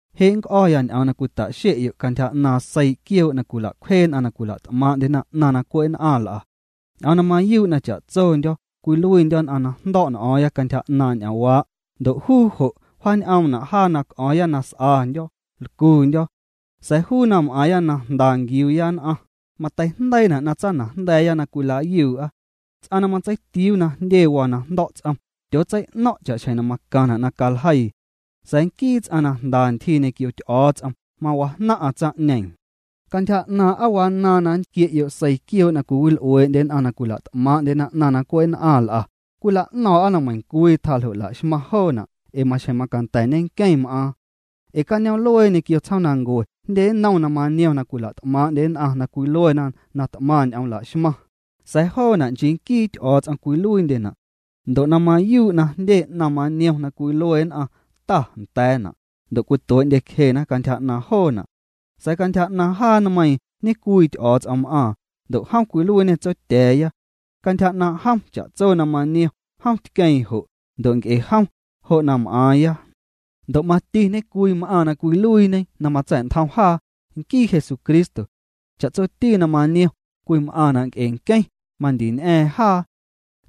Je' nnc'o̱ya ñ'oom na cwita'xe'yo' cantyja 'naaⁿ seii quioo' na cwila'cwjee nn'aⁿ na cwila't'maaⁿ'ndyena 'naⁿ na cwe' nn'aⁿ l'a. Ñ'oom na mayuu' na cha'tsondyo̱ cwiluiindyo̱ nn'aⁿ na jndo̱' n'o̱o̱ⁿya cantyja 'naaⁿ' ñ'oomwaa', ndo' juu jo' wjan'oomna' jaa na c'o̱o̱ⁿya na s'andyo̱, lcundyo̱. Sa̱a̱ juu na m'aaⁿya na jnda nquiuuya nn'aⁿ, mateijndeiina' na tsaanajnda̱a̱ya na cwila'yuu'a. Ts'aⁿ na matseitiuu na jndye waa na jndo̱' ts'om, tyootsei'no̱ⁿ' cha'xjeⁿ na macaⁿna' na caljeii. Sa̱a̱ nquii ts'aⁿ na jnda ntyjii ñequio Ty'o̱o̱ts'om, mawajnaⁿ'aⁿ tsaⁿ'ñeeⁿ. Cantyja 'naaⁿ' aa wanaaⁿ na nntquie'yo' seii quioo' na cwiwil'uee'ndye nn'aⁿ na cwila't'maaⁿ'ndye 'naⁿ na cwe' nn'aⁿ l'a, cwila'no̱o̱ⁿ'a na meiⁿcwii tjaa ljo' la'xmaⁿ joona' ee maxjeⁿ macanda̱ nqueⁿ m'aaⁿ. Ee cañoom'luee ñequio tsjoomnancue jndye nnom na maniom na cwila't'maaⁿ'ndye nn'aⁿ na cwiluena na t'maⁿ ñ'oom la'xmaⁿ, sa̱a̱ joona' nchii nquii Ty'o̱o̱ts'om cwiluiindyena'. Ndo' na mayuu' na jndye 'naⁿ maniom na cwilue nn'aⁿ “Ta” nda̱a̱na', ndo' cwituee'ndyecjena cantyja 'naaⁿ joona'. Sa̱a̱ cantyja 'naaⁿ jaa nmeiiⁿ ñecwii Ty'o̱o̱ts'om m'aaⁿ, ndo' jom cwiluiiñê Tsotya̱a̱ya. Cantyja 'naaⁿ' jom cha'tso na maniom, jom tqueeⁿ jo', ndo' nc'e jom, jo' na m'aaⁿya. Ndo' mati ñecwii m'aaⁿ na cwiluiiñe na matsa̱'ntjom jaa, nquii Jesucristo. Cha'tsoti na maniom, cwim'aⁿna' nc'e nqueⁿ, mandii ñ'a̱a̱ⁿ jaa.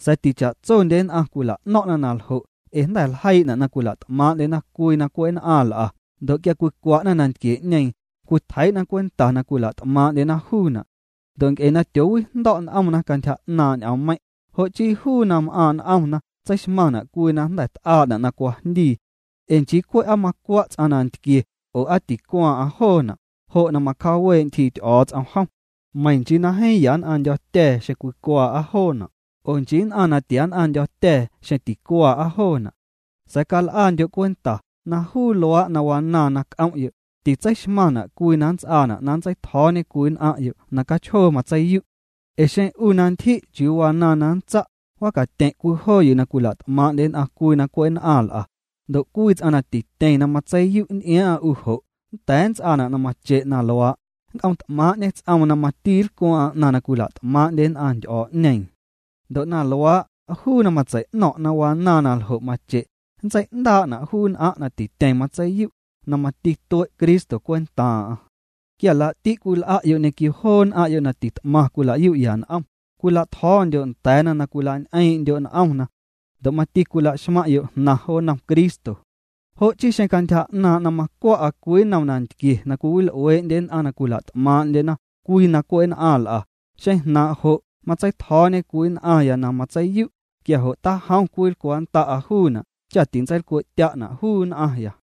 Sa̱a̱ ticha'tsondye nn'aⁿ cwila'no̱ⁿ'na na ljo' ee jnda̱ ljeii'na' na cwila't'maaⁿ'ndyena cwii na cwe' nn'aⁿ l'a, ndo' quia cwicwa'na nantquie'ñeeⁿ, cwitjeii'na cwenta na cwila't'maaⁿ'ndyena juuna'. Ndo' nc'e na tyoowijndo̱' n'omna cantyja 'naaⁿ' ñ'oommeiⁿ', jo' chii juu na m'aaⁿ' n'omna tseixmaⁿna' cwii na jnda̱ t'aa'na' na cwajndii. Ee nchii cwe' aa macwa' ts'aⁿ nantquie'ñeeⁿ, oo, aa ticwaaⁿ'aⁿ joona', jo' na macjaawee' ntyjii Ty'o̱o̱ts'om jom. Meiⁿ nchii na jeeⁿ ya nn'aⁿndyo̱tya̱a̱ xeⁿ cwicwaa'a joona', oo nchii nn'aⁿ na tiann'aⁿndyo̱tya̱a̱ xeⁿ ticwaa'a joona'. Sa̱a̱ cal'andyo' cwenta na juu luaa' na wanaaⁿ na c'om'yo', titseixmaⁿna' cwii na nnts'aana' na nntseitjo̱o̱ñe cwii nn'aⁿ'yo' na cachjoo matseiyu'. Ee xeⁿ 'u na ntyji' chiuu wanaaⁿ na nntsa', mawacatyeⁿ' cwii joo yuu na cwila't'maaⁿ'ndye nn'aⁿ cwii na cwe' nn'aⁿ l'a, ndo' cwii ts'aⁿ na tityeⁿ na matseiyu' nty'iaaⁿ'aⁿ 'u jo', nnda̱a̱ nnts'aana' na mache' na luaa', nnc'omt'maaⁿ'ñe ts'oom na mati lcwaaⁿ'aⁿ 'naⁿ na cwila't'maaⁿ'ndye nn'aⁿ ty'o̱o̱'ñeeⁿ. Ndo' na luaa', juu na matsei'no̱ⁿ' na wanaaⁿ na ljo' mache', nntsei'ndaa'na' juu nn'aⁿ' na tityeⁿ matseiyu', na mati tue' Cristo cwentaaⁿ'aⁿ'. Quia laa'ti' cwil'a'yo' ñequio joo nn'aⁿ'yo' na tit'maⁿ cwilayu'ya n'om, cwila'tjo̱o̱ndyo' nda̱a̱na na cwila'ñ'eeⁿ'ndyo' n'omna. Ndo' mati cwilaxmaⁿ'yo' jnaⁿ jo nnom Cristo. Jo' chii xeⁿ cantyja 'naaⁿ' na macwa'a cwii nnom nantquie na cwiwil'uee'ndye nn'aⁿ na cwila't'maaⁿ'ndye cwii na cwe' nn'aⁿ l'a, xeⁿ jnaaⁿ' jo' matseitjo̱o̱ñe cwii nn'aⁿya na matseiyu', quia jo' tajom cwinlcwaa'nnda'a juuna' cha tintseilcwe'tya'na juu nn'aⁿya.